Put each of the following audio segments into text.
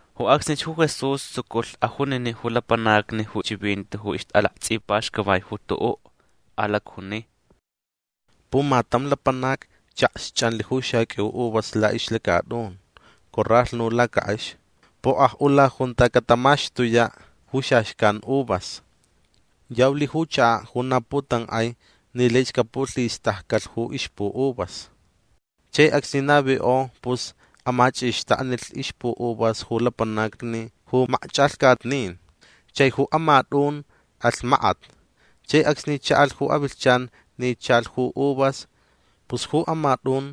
Ju acsnich ju Jesús tsuculh ajuniniʼ ju lapanacni ju chivinti ju ixtʼalaktsʼipaxcavaich ju tuʼuʼ. Alacjuni: ―Pumatam lapanac chakxchʼanlh ju xaqʼuiu uvas laʼixlacatʼun. Coralhnu lacakʼex. Pokʼajʼula junta catamaxtuyaʼ ju xaxcan uvas. Yaulh ju chakaʼ ju na putankʼai ni laich capulhistaccalh ju ixpuʼuvas. Chai acsni navikʼo pus amachʼixtaknilh ixpuʼuvas ju lapanacni ju makchʼalhcatnin. Chai ju amatʼun alh makat. Chai acsni chaʼalh ju avilhchan ni chalh ju uvas pus ju amatʼun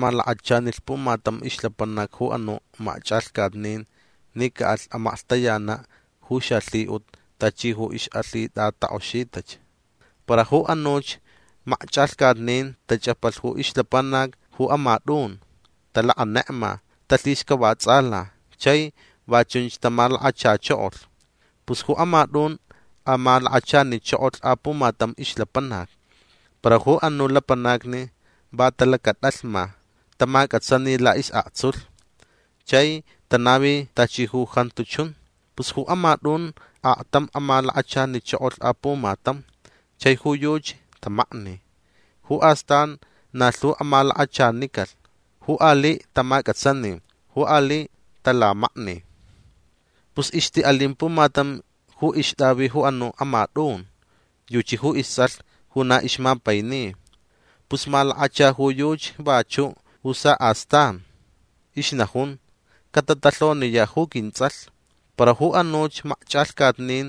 malakachanilh pumatam ixlapanac ju anuʼ makchʼalhcatnin ni caʼalh amaklhtayanaʼ ju xalhiʼut tachi ju ixʼalhitʼatakʼoxitach. Para ju anuch makchʼalhcatnin tachʼapalh ju ixlapanac ju amatʼun. Talakʼanekma. Talhixcavatsʼala chai va chunch tamalakachachokolh. Pus ju amatʼun amalakachanichokolh apumatam ixlapanac. Para ju anuʼ lapanacni va talacatʼalhma. Tamacʼatsani laʼisʼaktsulh. Chai tanavi tachi ju jantu chun. Pus ju amatʼun aktam amalakachanichokolh apumatam. Chai ju yuchi tamakni. Ju astan na lhu amalakachanicalh. Ju aliʼ tamacʼatsani. Ju aliʼ talamakni. Pus ixtiʼalin pumatam ju ixtʼavi ju anuʼ amatʼun. Yuchi ju istsʼalh ju na ixmapaini. Pus malakacha ju yuchi vachuʼ ju saʼastan. Ixnajun: “Catatalhoniyaʼ ju quintsʼalh”. Para ju anuch makchʼalhcatnin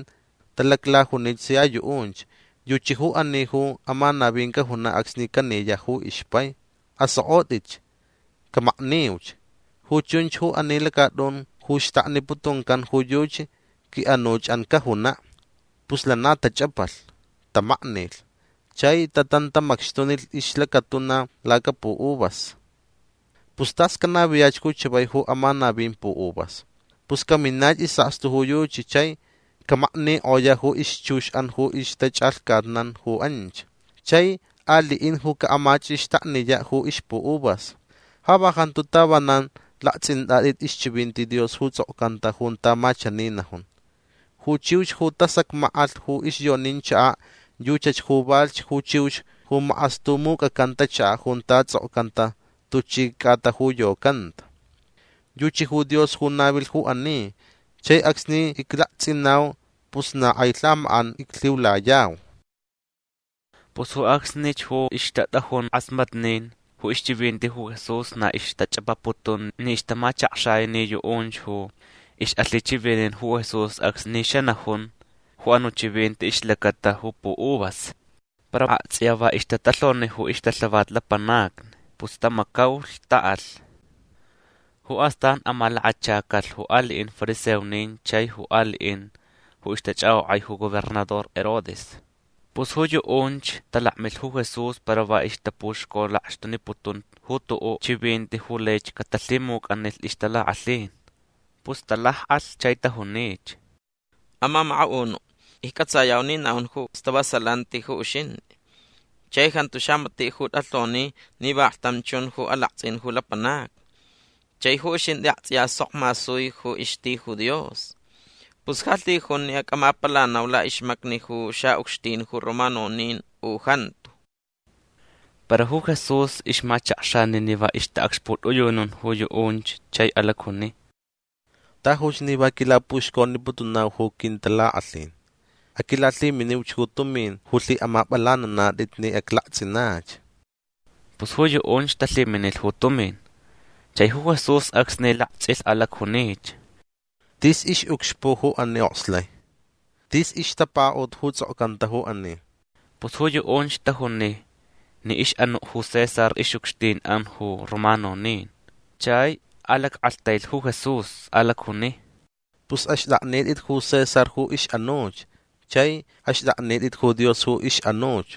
talaclajunich sia yuʼunch: “Yuchi ju ani ju amanavin cajunaʼ acsni caniyaʼ ju ixpai. Asokʼotʼitch. Camakniuch. Ju chunch ju ani lacatʼun ju xtakniputuncan ju yuchi quiʼanuchʼan cajunaʼ”. Pus lana tachʼapalh. Tamaknilh. Chai tatantamacxtunilh ixlacatuna lacapuʼuvas. Pus tas canaviyach ju chavai ju amanavin puʼuvas. Pus caminach isʼakstu ju yuchi chai camaknikʼoyaʼ ju ixchuxʼan ju ixtachʼalhcatnan ju anch. Chai aliʼin ju caʼamachʼixtakniyaʼ ju ixpuʼuvas. Ja va jantu tavanan laktsʼintʼatʼit ixchivinti Dios ju tsʼokcanta junta ma chani najun: Ju chiux ju tasacmackʼalh ju ixyonin chakaʼ yuchach ju valhch ju chiux ju makʼastumucʼacanta chakaʼ junta tsʼokcanta tuchi cʼata ju yocanta. Yuchi ju Dios ju navilh ju ani. Chai acsni iclaktsʼinau pus na kʼai lhamakʼan iclhiulayau. Pus ju acsnich ju ixtatʼajun kʼasmatnin ju ixchivinti ju Jesús na ixtachʼapaputun ni ixtamachakxai ni yuʼunch ju ixʼalhichivinin ju Jesús acsni xanajun ju anuʼ chivinti ixlacata ju puʼuvas. Para aktsʼiya va ixtatalhoni ju ixtalhavat lapanacni. Pus tamacaulh. Taʼalh. Ju astan amalakachacalh ju aliʼin fariseonin chai ju aliʼin ju ixtachʼakʼokʼai ju gobernador Herodes. Pus ju yuʼunch talakmilh ju Jesús para va ixtapuxcolakxtuniputun ju tuʼuʼ chivinti ju laich catalhimucʼanilh ixtalakʼalhin. Pus talakʼalh chai tajunich: ―Amamakaʼunuʼ iccʼatsayau ni naʼun ju stavasalanti ju uxintʼi. Chai jantu xamatiʼ ju tʼalhoni ni vaklhtam chun ju alaktsʼin ju lapanacni. Chai ju uxintʼi aktsʼiya sok masui ju ixti ju Dios. Pus ja lhijun ni acʼamapalanau laʼixmacni ju xaʼucxtin ju romanonin u jantu. Para ju Jesús ixmachakxani ni va ixtaʼacxputʼiyunun ju yuʼunch chai alacjuni: ―Tajuch ni va quilapuxconiputunau ju quintalakʼalhin. Aquilalhiminiuch ju tumin ju lhiʼamapʼalananatʼit ni aclaktsʼinach. Pus ju yuʼunch talhiminilh ju tumin. Chai ju Jesús acsni laktsʼilh alacjunich: ―Tis ixʼucxpuʼ ju ani okslai. Tis ixtapakaʼut ju tsʼokcanta ju ani. Pus ju yuʼunch tajuni ni ixʼanuʼ ju César ixʼucxtinʼan ju romanonin. Chai alackʼalhtailh ju Jesús. Alacjuni: ―Pus axtʼaknitʼit ju César ju ixʼanuch. Chai axtʼaknitʼit ju Dios ju ixʼanuch.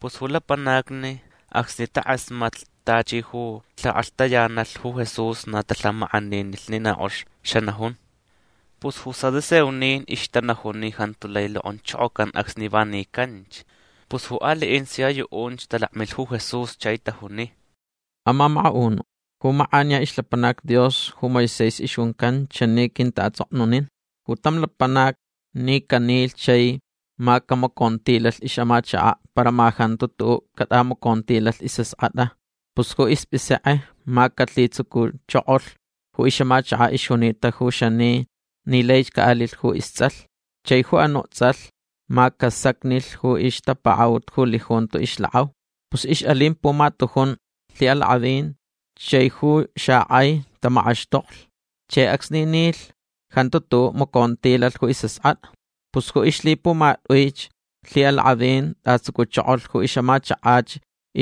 Pus ju lapanacni acsni takʼasmatlh tachi ju lhikʼalhtayanalh ju Jesús na talhamakʼaninilh ni na kʼox xanajun. Pus ju saduceonin ixtanajun ni jantu lai lokʼonchokocan acsni va nicanch. Pus ju aliʼin sia yuʼunch talakmilh ju Jesús chai tajuni: ―Amamakaʼunuʼ ju makʼaniya ixlapanac Dios ju Moisés ixjuncan chani quintaʼatsʼoknunilh: “Ju tam lapanac ni canilh chai ma camacontilalh ixʼamachakaʼ para ma jantu tuʼuʼ catʼamacontilalh isʼaskʼatʼa pus ju ispʼisekʼe ma calhitsucuchokolh ju ixʼamachakach ixjunita ju xani ni laich caʼalilh ju istsʼalh. Chai ju anuʼ tsʼalh ma casacnilh ju ixtapakaʼut ju lijunto ixlakʼau”. Pus ixʼalin pumatujun lhiʼalakʼavin. Chai ju xakʼai tamakʼaxtoklh. Chai acsni nilh jantu tuʼuʼ macontilalh ju isʼaskʼatʼa. Pus ju ixlhipumatʼuich lhiʼalakʼavin tʼatsucuchokolh ju ixʼamachakach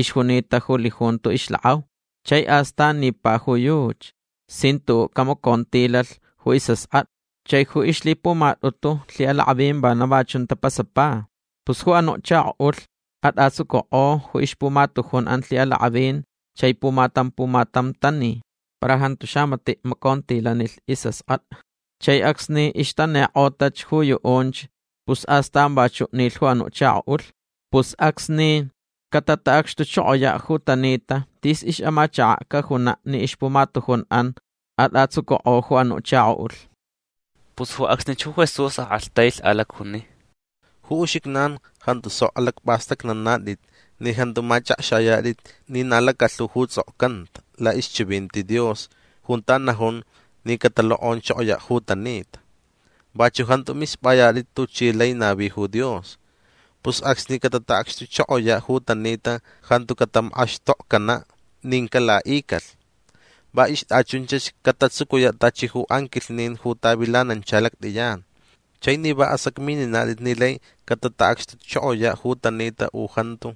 ixjunita ju lijunto ixlakʼau. Chai astan nipa ju yuchi sin tuʼuʼ camacontilalh ju isʼaskʼatʼa. Chai ju ixlhipumatʼutu lhiʼalakʼavin vana va chun tapasapa. Pus ju anuʼ chakoʼulh tʼatsucukʼo ju ixpumatujunʼan lhiʼalakʼavin chai pumatam pumatam tani. Para jantu xamatiʼ macontilanilh isʼaskʼatʼa. Chai acsni ixtanikʼota ju yuʼunch pus astan vachuʼ nilh ju anuʼ chakoʼulh. Pus acsni cataʼacxtuchokoyaʼ ju tanita tis ixʼamachakaʼ cajunaʼ ni ixpumatujunʼan atʼatsucukʼo ju anuʼ chakoʼulh. Pus ju acsnich ju Jesús akʼalhtailh. Alacjuni: ―Ju uxijnan jantu sok alacpʼastʼacnanatʼit ni jantu machʼakxayatʼit ni na lacalhu ju tsʼokcanta laʼixchivinti Dios junta najun ni catalokʼonchokoyaʼ ju tanita. Vachuʼ jantu mispʼayatʼit tuchi lai navi ju Dios. Pus acsni cataʼacxtuchokoyaʼ ju tanita jantu catamakʼaxtokcanaʼ nin calaʼicalh. Va ixtʼachunchach catatsucuyaʼ tachi ju anquilhnin ju tavilanancha lactʼiyan. Chai ni va asacmininatʼit ni lai cataʼacxtuchokoyaʼ ju tanita u jantu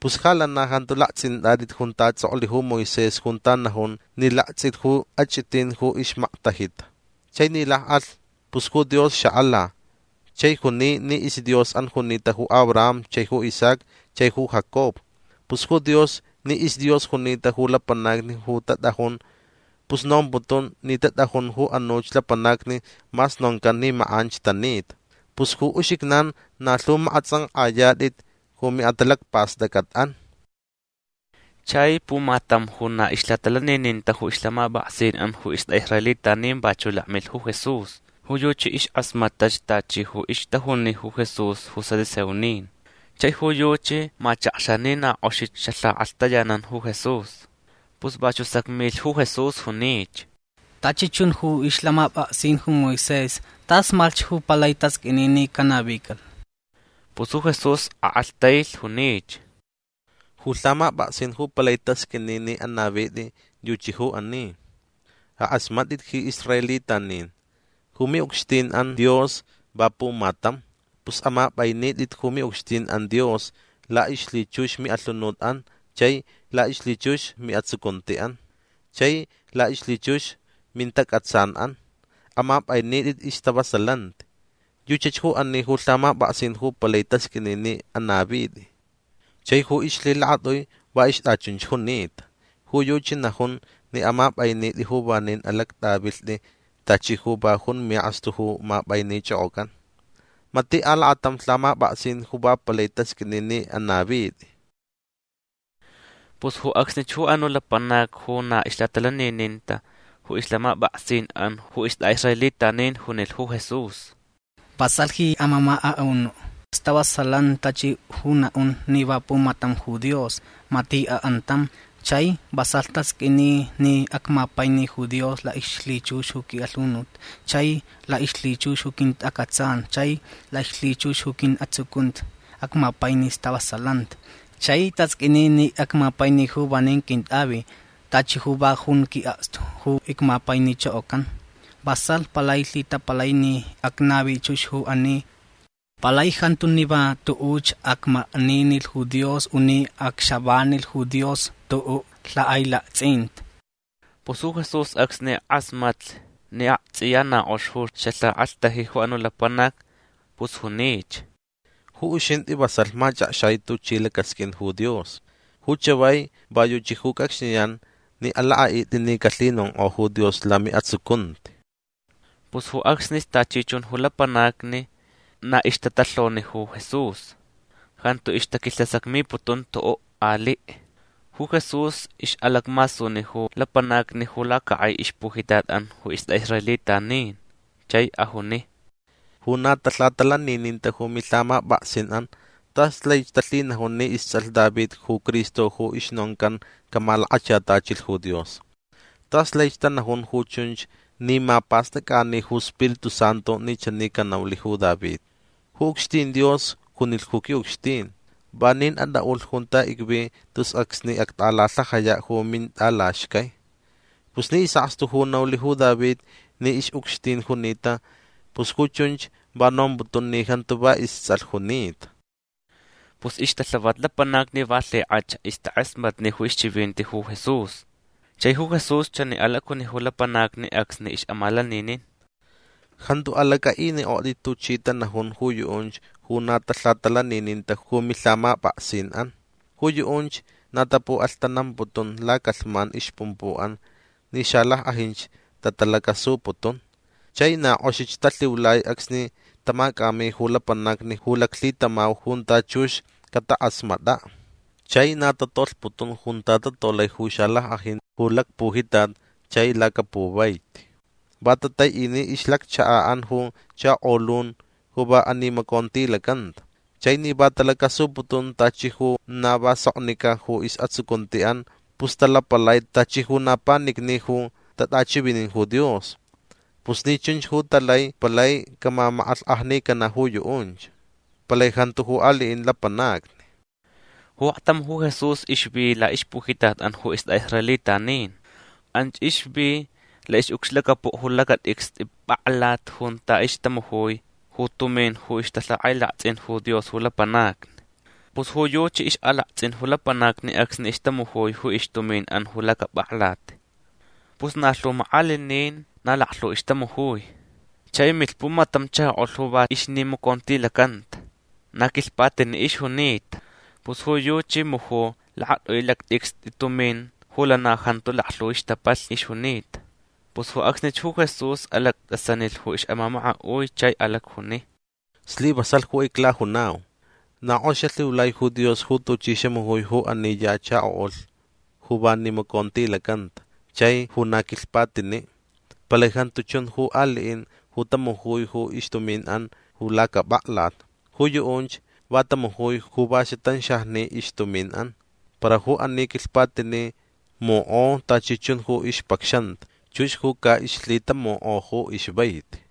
pus ja lana jantu laktsʼintʼatʼit junta tsʼoklh ju Moisés junta najun ni laktsʼilh ju achʼitin ju ixmaktajita. Chai ni lakʼalh pus ju Dios xakʼala chai juni ni isDiosʼan junita ju Abraham chai ju Isaac chai ju Jacob. Pus ju Dios ni isDios junita ju lapanacni ju tatʼajun pus nomputun ni tatʼajun ju anuch lapanacni mas noncan ni makʼanch tanita. Pus ju uxijnan na lhu makʼatsʼankʼayatʼit ju miʼatalacpastʼacʼatʼan. Chai pumatam ju na ixlhatalanininta ju ixlhamapʼaksinʼan ju istʼaʼisraelitanin vachuʼ lakmilh ju Jesús. Ju yuchi iskʼasmatach tachi ju ixtajuni ju Jesús ju saduceonin. Chai ju yuchi machakxa ni na kʼoxich ju xalhakʼalhtayanan ju Jesús. Pus vachuʼ sacmilh ju Jesús. Junich: ―Tachi chun ju ixlhamapʼaksin ju Moisés tasmalhch ju palai tasqʼuini ni canavicalh. Pus ju Jesús kʼalhtailh. Junich: ―Ju lhamapʼaksin ju palai tasqʼuini ni anavitʼi yuchi ju ani: “Akʼasmatʼit ji israelitanin. Ju miʼucxtinʼan Dios va pumatam. Pus amapʼainitʼit ju miʼucxtinʼan Dios laʼixlhichux miʼalhunutʼan chai laʼixlhichux miʼatsucuntiʼan chai laʼixlhichux mintacʼatsanʼan. Amapʼainitʼit istavasalanti”. Yuchach ju ani ju lhamapʼaksin ju palai tasqʼuini ni anavitʼi. Chai ju ixlhilakatʼui va ixtʼachunch junita. Ju yuchi najun ni amapʼainitʼi ju vanin alactʼavilhtʼi tachi ju va jun miʼakstu ju mapʼainichʼokʼocʼan. Matiʼ alakatam lhamapʼaksin ju va palai tasqʼuini ni anavitʼi. Pus ju acsnich ju anuʼ lapanac ju na ixlhatalanininta ju ixlhamapʼaksinʼan ju istʼaʼisraelitanin junilh ju Jesús: ―Vasalh ji amamakaʼunuʼ. Stavasalanti tachi ju naʼun ni va pumatam ju Dios. Matiʼ akʼantam. Chai vasalh tasqʼuini ni acmapaini ju Dios laʼixlhichux ju quiʼalhunut chai laʼixlhichux ju quintacʼatsan chai laʼixlhichux ju quiʼatsucunti. Acmapaini istavasalanti. Chai tasqʼuini ni acmapaini ju vanin quintʼavi tachi ju va jun quiʼakstu ju icmapainichokocan. Vasalh palai lhitapalai ni acnavi chux ju ani. Palai jantu ni va tuʼuch acmakninilh ju Dios u ni acxavanilh ju Dios tuʼuʼ lhakʼailaktsʼinti. Pus ju Jesús acsni kʼasmatlh ni aktsʼiya na kʼox ju xalhikʼalhtaji ju anuʼ lapanac pus junich: ―Ju uxintʼi vasalh machʼakxai tuchi lacasqʼuin ju Dios. Ju chavai va yuchi ju cʼacxniyan ni alakʼaʼitʼi ni calhinonkʼo ju Dios lamiʼatsucunti. Pus ju acsnich tachi chun ju lapanacni na ixtatalhoni ju Jesús. Jantu ixtaquilhasacmiputun tuʼuʼ aliʼ. Ju Jesús ixʼalacmasuni ju lapanacni ju lacakʼai ixpujitatʼan ju istʼaʼisraelitanin. Chai ajuni: ―Ju na talhatalanininta ju milhamapʼaksinʼan tas laich talhinajun ni istsʼalh David ju Cristo ju ixnoncan camalakachatachilh ju Dios. Tas laich tanajun ju chunch ni mapastʼacʼani ju Spiritu Santu ni chani canaulh ju David: Ju ucxtin Dios junilh ju quiʼucxtin: “Vanin atʼaʼulh junta icvi tus acsni actʼalalhajayaʼ ju mintʼalaxcai”. Pus ni isʼakstu ju naulh ju David ni ixʼucxtin junita pus ju chunch va nomputun ni jantu va istsʼalh junita. Pus ixtalhavat lapanacni va lhikʼach ixtakʼasmatni ju ixchivinti ju Jesús. Chai ju Jesús chani alacjuni ju lapanacni acsni ixʼamalaninin: ―Jantu alacʼaʼinikʼotʼit tuchi tanajun ju yuʼunch ju na talhatalanininta ju milhamapʼaksinʼan. Ju yuʼunch na tapuʼalhtanamputun lacalhman ixpumpuʼan ni xalackʼajinch tatalacasuputun. Chai na kʼoxich talhiulai acsni tamacʼami ju lapanacni ju laclhitamau junta chux catakʼasmatʼaʼ. Chai na tatolhputun junta tatolai ju xalackʼajin ju lacpujitat chai lacapuvai. Va tataiʼini ixlacchakaʼan ju chakolun ju va animacontilacanta. Chai ni va talacasuputun tachi ju na va soknicʼa ju isʼatsucuntiʼan pus talapalai tachi ju na panicni ju tatʼachivinin ju Dios. Pus ni chunch ju talai palai camamakʼalhkʼajnicanaʼ ju yuʼunch. Palai jantu ju aliʼin lapanacni. Ju aktam ju Jesús ixvi laʼixpujitatʼan ju istʼaʼisraelitanin. Anch ixvi laʼixʼucxlacapuʼ ju lacatʼicstʼi pʼaklat junta ixtamujui ju tumin ju ixtalhakʼailaktsʼin ju Dios ju lapanacni. Pus ju yuchi ixʼalaktsʼin ju lapanacni acsni ixtamujui ju ixtuminʼan ju lacapʼaklat. Pus na lhu makʼalinin na laklhu ixtamujui. Chai milh pumatam chakoʼulh ju va ixnimacontilacanta. Na quilhpatiniʼ ixjunita. Pus ju yuchi muju lakatʼui lactʼicstʼi tumin ju lana jantu laklhu ixtapalh ixjunita. Pus ju acsnich ju Jesús alactʼasanilh ju ixʼamamakaʼui chai alacjuni: ―Slivasalh ju iclajunau. Na kʼox xalhiulai ju Dios ju tuchi xamujui ju ani ya chakoʼulh ju va nimacontilacanta chai ju na quilhpatiniʼ. Palai jantu chun ju aliʼin ju tamujui ju ixtuminʼan ju lacapʼaklat. Ju yuʼunch va tamujui ju va xatanxajni ixtuminʼan. Para ju ani quilhpatiniʼ mukʼo tachi chun ju ixpacxanta. Chux ju caʼixlhitamaʼuta ju ixvaiti.